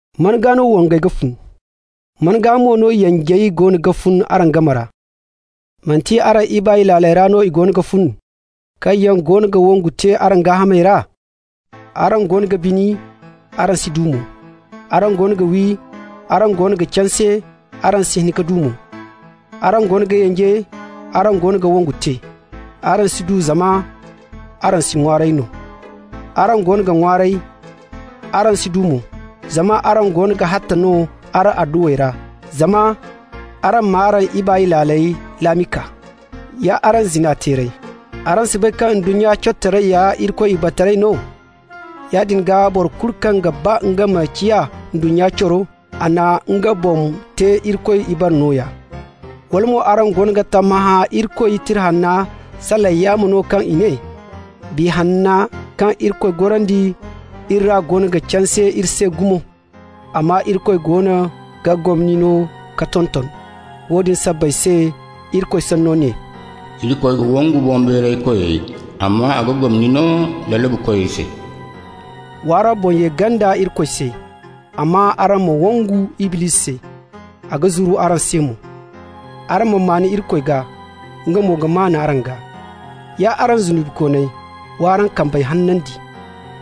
Man gaa no wongey goono ga fun? Man gaa mo no yanjey goono ga fun araŋ game ra? Manti araŋ ibaay laaley ra no i goono ga fun, kaŋ yaŋ goono ga wongu te araŋ gaahamey ra? Araŋ goono ga bini, araŋ si du mo. Araŋ goono ga wi, araŋ goono ga canse, araŋ si hin ka du mo. Araŋ goono ga yanje, araŋ goono ga wongu te. Araŋ si du zama araŋ si ŋwaaray no. Araŋ goono ga ŋwaaray, araŋ si du mo, zama araŋ goono ga hatta no araŋ adduwey ra, zama araŋ m'araŋ ibaay laaley laami kaa. Ya araŋ zina-teerey, araŋ si bay kaŋ ndunnya corotaray ya Irikoy ibaretaray no? Yaadin gaa, boro kulu kaŋ ga ba nga ma ciya ndunnya coro, a na nga boŋ te Irikoy ibare nooya. Wala mo araŋ goono ga tammahã Irikoy Tira Hanney salaŋ yaamo no kaŋ i ne: Biya Hanna kaŋ Irikoy gorandi iri ra goono ga canse iri se gumo? Amma Irikoy goono ga gomni no ka tonton. Woodin sabbay se Irikoy Sanno ne: «Irikoy ga wangu boŋbeeraykoy, Amma a ga gomni no lalabukoy se.» Wa araŋ boŋ ye ganda Irikoy se, amma araŋ ma wangu Iblisi se, a ga zuru araŋ se mo. Araŋ ma maan Irikoy gaa, nga mo ga maan araŋ gaa. Ya araŋ zunubikooney, w'araŋ kambey hanandi!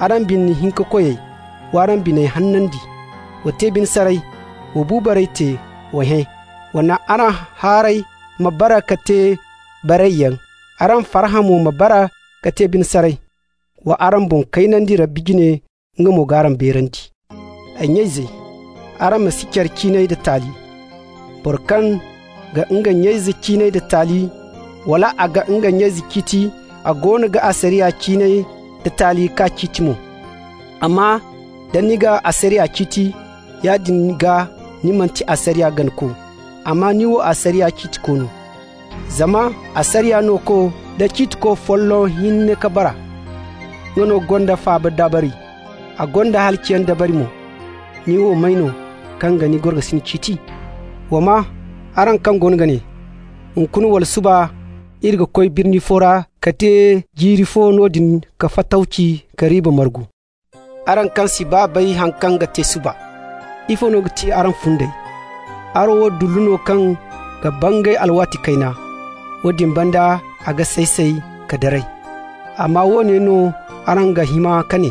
Araŋ bine-hinka-koyey, w'araŋ biney hanandi! Wa te bine saray, wa bu baray te, wa hẽ. Wa naŋ araŋ haarey ma bare ka te barayyaŋ, araŋ farhã mo ma bare ka te bine saray! Wa araŋ boŋ kaynandi Rabbi jine, nga mo g'araŋ beerandi. Ay nya-izey, araŋ ma si care ciinay da taali. Boro kaŋ ga nga nya-ize ciinay da taali, wala a ga nga nya-ize ciiti, a goono ga asariya ciinay da taali k'a ciiti mo. Amma da ni ga asariya ciiti, yaadin gaa ni manti asariya ganako, amma ni wo asariya ciitiko no. Zama asariya Nooko da Ciitiko folloŋ hinne ka bara. Nga no gonda faaba dabari, a gonda halaciyaŋ dabari mo. Ni wo may no, kaŋ ga ni gorokasin ciiti? Wa maa, araŋ kaŋ goono ga ne: «Hunkuna wala suba iri ga koy birni fo ra ka te jiiri fo noodin ka fatawci ka riiba margu.» Araŋ kaŋ si baa bay haŋ kaŋ ga te suba! Ifo no ga ti araŋ fundey? Araŋ wo dullu no kaŋ ga bangay alwaati kayna, woodin banda a ga say-say ka daray. Amma woone no araŋ ga hima ka ne: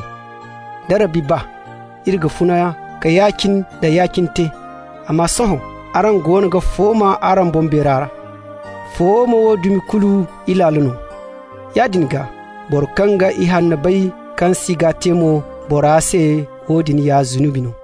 Da Rabbi ba, iri ga funa ka ya-cine nda ya-cine te. Amma sohõ araŋ goono ga fooma araŋ boŋbeera ra. Fooma wo dumi kulu ilaalo no. Yaadin gaa, boro kaŋ ga ihanno bay kaŋ si g'a te mo, bora se woodin ya zunubi no.